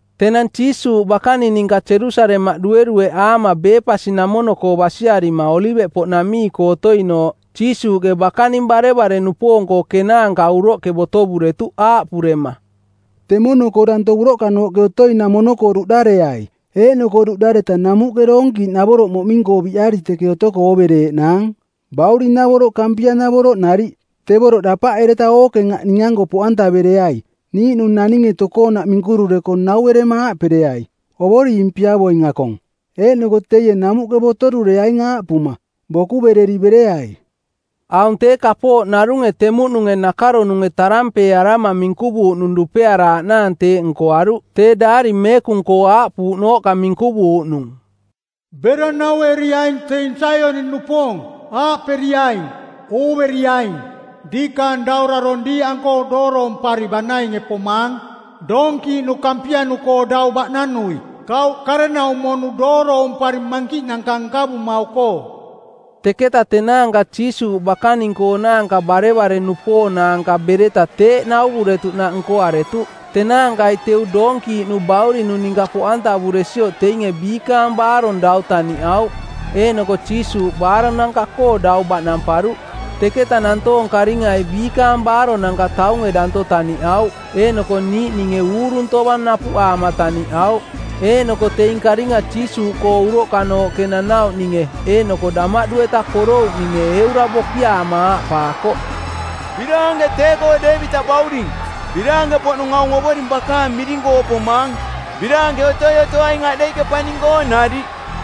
Tenang Jiisuuꞌ bakaning ninka Jerusalemaꞌ duerueꞌaama Bepasi-namono-koo basiarima Oliveꞌpoꞌnamii-koo otoinooꞌ, Jiisuuꞌke bakaning barevare-nupoong-koo kenaanka uroꞌke botovuretuꞌ aaꞌpurema, “Temono-koo danto uroꞌkanooꞌke otoi-namono-koo duꞌdareai, eeꞌnoko duꞌdareta namuꞌke doonkiiꞌnavoroꞌ moꞌming-koo biꞌari teke otoko oovereeꞌnaang, bauring-navoroꞌ kampia-navoroꞌ nariꞌ. Tevoroꞌ dapaꞌereta ookeng aꞌ ning-anko poꞌantavereai. Niiꞌnung naninge tokoonaꞌ minkurureko nauerema aaꞌpereai, ‘Ovoring piavoing akong,’ eeꞌnoko teie namuꞌke botorureaing aaꞌpuma, ‘Bokuvereri bereai.’” Aung tee kapooꞌ narunge temuꞌnunge nakaronunge tarampeearama˜ minkuvuuꞌnung dupearaaꞌnaang teeꞌ nkoaruꞌ, tee Daari Meekung-koo aaꞌpuuꞌnooꞌka minkuvuuꞌnung, “Bera naueriai teing Saioni-nupoong, aaꞌperiaing, ‘Ooveriaing, diikaang daurarong˜ diiꞌanko dooroompari banainge pomaang, doonkiiꞌnu kampianu-koo dau baꞌnanui, kauꞌ karenaumo-nu dooroompari mankiꞌnanka nkavumau-koo.’” Teketa tenaanka Jiisuuꞌ bakaning-koonaanka barevare-nupoong-naanka bereta teeꞌ nauvuretuꞌnaꞌ nkoaretuꞌ. Tenaankai teu doonkiiꞌnu baurinu ninka poꞌantavuresioꞌ teinge biikaang baarong dau taniꞌauꞌ, eeꞌnoko Jiisuuꞌ baaronanka-koo dau baꞌnamparuꞌ. Teketa nantoong karingai biikaang baaronanka taunge danto taniꞌauꞌ, eeꞌnoko niiꞌninge uurung tovang napuꞌaama taniꞌauꞌ. Eeꞌnoko teing karinga Jiisuuꞌkoo uroꞌkanooꞌke nanauꞌninge eeꞌnoko damaꞌdu-eta porouꞌninge eura bokiaama aaꞌpaakoꞌ, “Biraanke tee-koo Deevitaꞌ bauring! Biraanke-poꞌnung aung Ovoring bakaang miring-koo pomaang! Biraanke otoi otoaing aꞌdeiꞌke paning-koo nariꞌ!”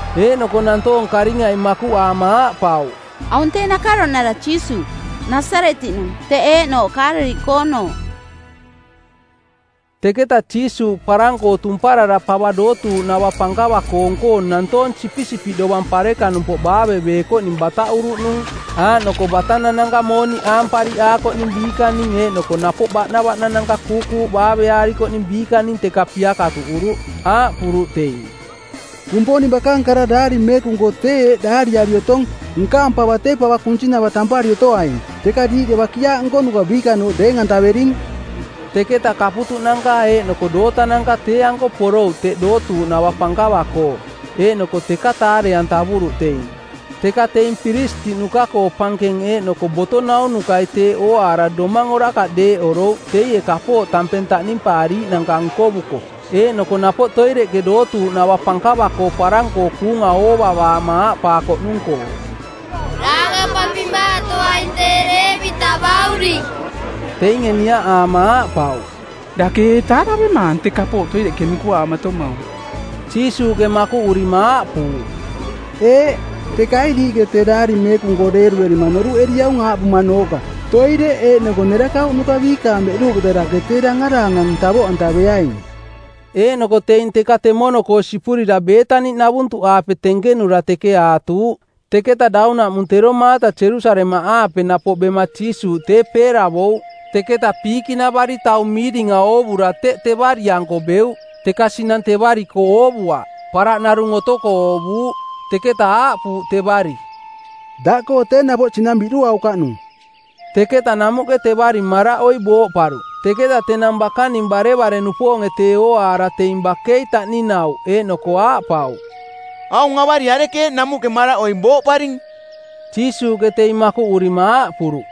Eeꞌnoko nantoong karingai makuꞌaama aaꞌpauꞌ, “Aung tee nakaronara Jiisuuꞌ, Nasaretiꞌnung, teꞌ eeꞌnooꞌ Kaaleliꞌkoonooꞌ.” Teketa Jiisuuꞌ parang-koo tumparara pava dootuuꞌnava pankava-koong-koo nantoong sipisipiꞌ dovang parekanumpoꞌ baaveveekoꞌning bataꞌuruꞌnung. Aaꞌnoko batanananka mooniꞌ aampariꞌaakoꞌning biikaning eeꞌnoko napoꞌ baꞌnavaꞌnananka kuukuuꞌ baave-aarikoꞌning biikaning teka piakatuꞌuruꞌ. Aaꞌpuruꞌ teing, “Kumponing bakaang kara Daari Meekung-koo tee eeꞌ daariari otong, ‘Nkaang pava tee pava kunsinava tampari otoaing,’ teka diiꞌke ‘bakiaaꞌ nkonuka biikanooꞌ’ deeng-antavering.” Teketa kaputuꞌnanka eeꞌnoko dootananka tee-anko porouꞌ teꞌ dootuuꞌnava pankava-koo, eeꞌnoko teka taare-antavuruꞌ teing. Teka teing piristiꞌnuka-koo pankenge eeꞌnoko boto naunukai teeꞌ ooaara domang orakaꞌ deeꞌorouꞌ teie kapooꞌ tampeng taꞌnimpaariiꞌnanka nkovuko eeꞌnoko napoꞌ toireꞌke dootuuꞌnava pankava-koo parang-koo kuunga oovavaama aaꞌpaakoꞌnung-koo, “Daangampampimaatoaing tee Deevitaꞌ bauring.” Teinge niaꞌaama aaꞌpauꞌ, “Dake ee taaravemaang tee kapooꞌ toireꞌke minkuaamatomaung?” Jiisuuꞌke makuꞌurima aaꞌpuuꞌ, “Eeꞌ. Teka ee diiꞌke tee Daari Meekung-koo deeruerima noruꞌeriaung aaꞌpumanooꞌka, ‘Toireꞌ eeꞌnoko nerakauꞌnuka biikaang beꞌduuꞌketa dake tee dangaraangang tavoꞌantaveaing?’” Eeꞌnoko teing teka temono-koo sipurira Beetani-navuntuꞌaape tenkenura teke aatuuꞌ. Teketa daunaꞌmung tero maata Jerusalemaꞌaape napoꞌ bema Jiisuuꞌ tee peeravouꞌ. Teketa piikiꞌnavari taung miiringa oovura teꞌ tevari-anko beuꞌ. Teka sinang tevari-koo oovuaꞌ, paraꞌ narung otoko oovuuꞌ. Teketa aaꞌpuuꞌ tevari, “Daꞌkoo tee napoꞌ sinang biꞌduaukaꞌnung.” Teketa namuꞌke tevari maraꞌoi booꞌparuꞌ. Teketa tenang bakaning barevare-nupoonge tee ooaara teing bakei taꞌninauꞌ eeꞌnoko aaꞌpauꞌ, “Aung avari arekeeꞌ namuꞌke maraꞌoi booꞌparing?” Jiisuuꞌke teing makuꞌurima aaꞌpuruꞌ,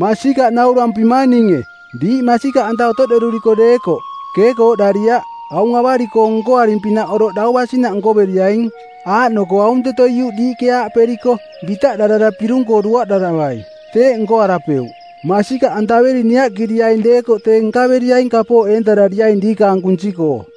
“Masikaꞌ naurampimang ninge, diiꞌ masikaꞌanta otoꞌderuri deekoꞌ, keekooꞌdariaꞌ, aung avari-koo nkoaring-pinaꞌ oroꞌ dau basinaꞌ nkoveriaing, aaꞌnoko aunteto iuꞌ diiꞌke aaꞌperiko, ‘Bitaꞌdarara pirung-koo duaꞌdaravai,’ teeꞌ nkoarapeuꞌ. Masikaꞌantaveri niaꞌkiriaing deekoꞌ tee nkaveriaing kapooꞌ eentarariaing diikaang kunsi-koo.”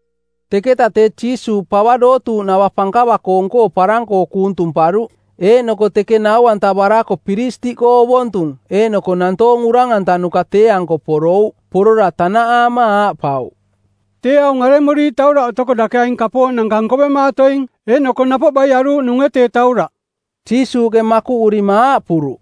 Teketa tee Jiisuuꞌ pava dootuuꞌnava pankava-koong-koo parang-koo kuung tumparuꞌ, eeꞌnoko teke nau-antavarako piristiꞌkoo ovontung eeꞌnoko nantoong urang-antanuka tee-anko porouꞌ. Porora tanaꞌaama aaꞌpauꞌ, “Tee aung aremuriiꞌ tauraꞌ otoko dake aing kapooꞌnanka nkovemaatoing? Eeꞌnoko napoꞌ baie aruuꞌnunge tee tauraꞌ?” Jiisuuꞌke makuꞌurima aaꞌpuruꞌ,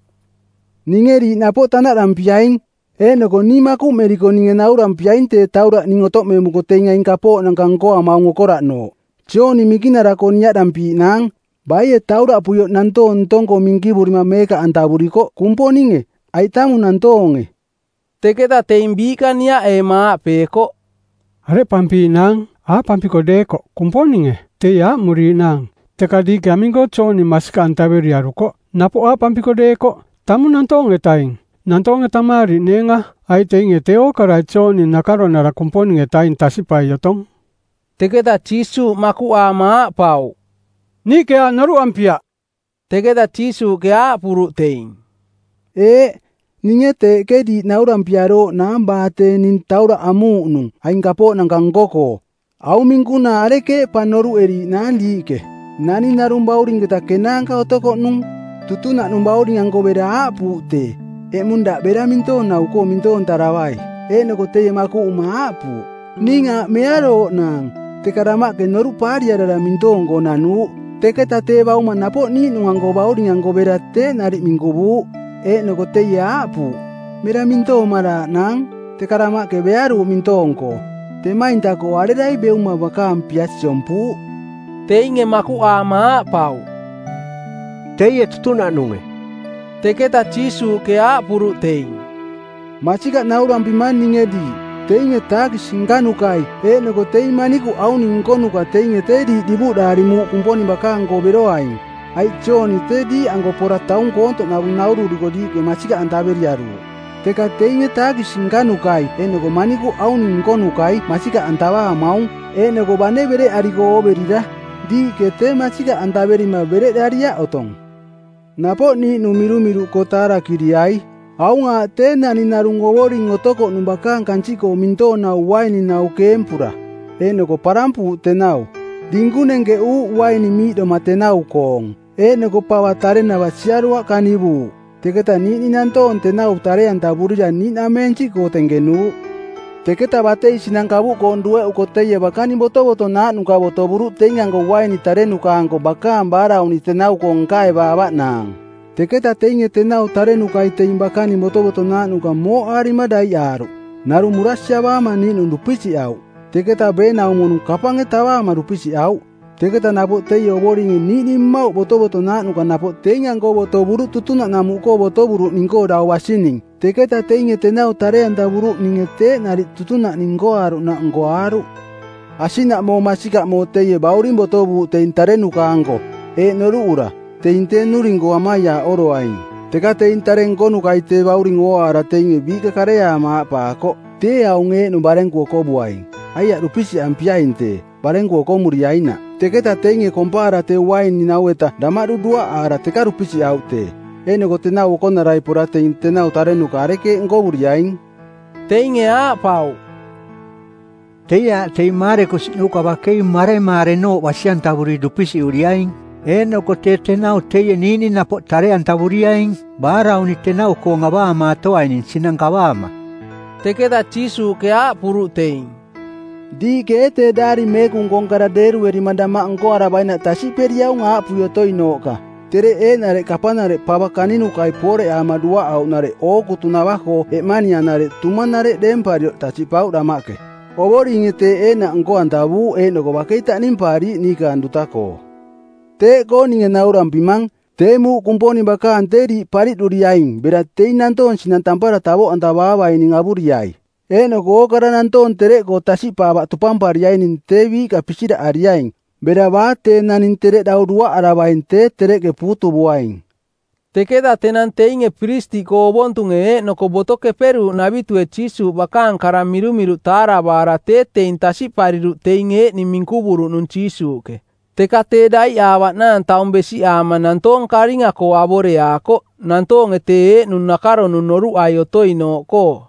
“Ninge diiꞌ napoꞌ tanaꞌdampiaing, eeꞌnoko ning makuꞌmeriko ninge naurampiaing tee tauraꞌ ning otoꞌmemuko teing aing kapooꞌnanka nkoamaung okoraꞌnooꞌ. Jooni Minkinara-koo niaꞌdampiiꞌnaang: baie tauraꞌpuioꞌ nantoong ntong-koo minkivurima meekaꞌantavurikoꞌ? Kumponinge, aiꞌ tamung nantoonge?” Teketa teing biiꞌka niaꞌeema aaꞌpeekoꞌ, “Areꞌpampiiꞌnaang? Aaꞌpampiko deekoꞌ, ‘Kumponinge,’ teie aaꞌmuriiꞌnaang, ‘Teka diiꞌke aming-koo Jooni masikaꞌantaveriarukoꞌ?’ Napoꞌ aaꞌpampiko deekoꞌ, ‘Tamung nantoong-etaing,’ nantoonge tamaariꞌneenga, aiꞌ teinge tee ookarai Jooni nakaronara Kumponing-etaing tasiꞌpai otong.” Teketa Jiisuuꞌ makuꞌaama aaꞌpauꞌ, “Niiꞌke aaꞌ noruꞌampiaꞌ.” Teketa Jiisuuꞌke aaꞌpuruꞌ teing, “Eeꞌ, ninge teeꞌke diiꞌ naurampiarooꞌnaang baa tee ning tauraꞌ amuuꞌnung aing kapooꞌnanka nko-koo.” “Aung minkunaa arekeeꞌ pa noruꞌeriiꞌnaang diiꞌke? Naning narung baurinketa kenaanka otokoꞌnung. Tutunaꞌnung bauring-anko bera aaꞌpuuꞌ tee, ‘Eꞌmung daꞌ bera mintoonau-koo mintoontaravai.’ Eeꞌnoko teie makuꞌuma aaꞌpuuꞌ, ‘Ning aaꞌ mearooꞌnaang,’ teka damaꞌke noruꞌ paariarara mintoong-koo nanuuꞌ. Teketa tee bauma napoꞌ niiꞌnung-anko bauring-anko bera teeꞌ nariꞌ minkuvuuꞌ, eeꞌnoko teie aaꞌpuuꞌ, ‘Mera mintoomaraaꞌnaang,’ teka damaꞌke bearuuꞌ mintoong-koo. Temainta-koo arerai beuma bakaang pia siompuuꞌ?” Teinge makuꞌaama aaꞌpauꞌ, “Teie tutunaꞌnunge.” Teketa Jiisuuꞌke aaꞌpuruꞌ teing, “Masikaꞌ naurampimang ninge diiꞌ, teinge taakisi nkanukai eeꞌnoko teing manikuꞌ auning nkonuka teinge tee diiꞌ divuꞌdaari muuꞌ Kumponing bakaang-koo beroaing. Aiꞌ Jooni tee diiꞌanko pora taung koontoꞌnavung naururiko diiꞌke masikaꞌantaveriaruuꞌ, teka teinge taakisi nkanukai eeꞌnoko manikuꞌ auning nkonukai masikaꞌantavaamaung, eeꞌnoko bane bereꞌariko ooverira, diiꞌke tee masikaꞌantaverima bereꞌdariaꞌ otong.” “Napoꞌ niiꞌnung mirumiruꞌkoo taarakiriai. Aung aaꞌ tee naning narung ovoring otokoꞌnung bakaang kansiꞌkoo mintoonau uaininau keempura. Eeꞌnoko parampuuꞌ tenau, dinkung nenkeꞌuuꞌ uaini miiꞌdoma tenau-koong. Eeꞌnoko pava tarenava siaruaꞌ kanivuuꞌ. Teketa niiꞌning nantoong tenau tare-antavurira niiꞌnameensiꞌkoo tenkenuuꞌ. Teketa batei sinang kavuꞌkoong dueꞌuko teie bakaning botovotonaaꞌnuka botovuruꞌ teing-anko uaini tarenuka-anko bakaang baarauni˜ tenau-koong nkaevaavaꞌnaang. Teketa teinge tenau tarenukai teing bakaning botovotonaaꞌnuka mooꞌaarima daiꞌaaruꞌ, narung murasiavaama niiꞌnung dupisiꞌauꞌ, teketa beenaumo-nung kapange tavaama dupisiꞌauꞌ. Teketa napoꞌ teie ovoringe niiꞌning mmauꞌ botovotonaaꞌnuka napoꞌ teing-anko botovuruꞌ tutunaꞌnamuꞌkoo botovuruꞌning-koo dau basining, teketa teinge tenau tare-antavuruꞌninge teeꞌ nariꞌ tutunaꞌning nkoaaruꞌnaꞌ nkoaaruꞌ. Asiꞌnaꞌmoo masikaꞌmoo teie bauring botovuuꞌ teing tarenuka-anko, eeꞌ noruꞌura, teing tee nnuring-koo amaiaaꞌoroaing. Teka teing tare nkonukai tee bauring ooaara teinge biiꞌka kareaama aaꞌpaakoꞌ, ‘Tee aung eeꞌnung barenku okovuaing. Aiaꞌ dupisiꞌampiaing tee, barenku okomuriainaꞌ.’ Teketa teinge kompaara tee uaininau-eta damaꞌdu duaꞌaara teka dupisiꞌauꞌ tee. Eeꞌnoko tenau okonarai pora teing tenau tarenuka arekeeꞌ nkovuriaing?” Teinge aaꞌpauꞌ, “Teie aaꞌ teing maarekusiꞌnuka bakei maremaarenooꞌ basi-antavuri dupisiꞌuriaing, eeꞌnoko tee tenau teie niiꞌning napoꞌ tare-antavuriaing baarauni˜ tenau-koong avaamatoaining sinang kavaama.” Teketa Jiisuuꞌke aaꞌpuruꞌ teing, “Diiꞌke ee tee Daari Meekung-koong kara deeruerima damaꞌ nkoaravainaꞌ tasiꞌperiaung aaꞌpui otoinooꞌka, ‘Tereꞌ eeꞌnareꞌ kapanareꞌ pava kaninukai pooreꞌaama duaꞌauꞌnareꞌ ookutunava-koo eꞌmanianareꞌ tumanareꞌ deemparioꞌ tasiꞌpauꞌ damaꞌke. Ovoringe teeꞌ eeꞌnaꞌ nko-antavuuꞌ eeꞌnoko bakei taꞌnimpaariiꞌ niikaang duta-koo.’ Teeꞌkoo ninge naurampimang, tee muuꞌ Kumponing bakaang tee diiꞌ pariꞌduriaing bera teing nantoong sinang tampara tavoꞌantavaavaining avuriai. Eeꞌnoko ookara nantoong tereꞌkoo tasiꞌpaavaꞌ tupampariaining tee biiꞌka pisiraꞌariaing, bera baa tee naning tereꞌ dau duaꞌaravaing tee tereꞌke puutuvuaing.” Teketa tenang teinge piristiꞌkoo ovontunge eeꞌnoko Boto Keperuuꞌnavitue Jiisuuꞌ bakaang kara mirumiruꞌ taaravaara tee teing tasiꞌpariruꞌ teing eeꞌning minkuvuruꞌnung Jiisuuꞌke. Teka tee daiꞌaavaꞌnaang taung besiꞌaama nantoong karinga-koo avoreaakoꞌ, nantoonge tee eeꞌnung nakaronung noruꞌai otoinooꞌkoo.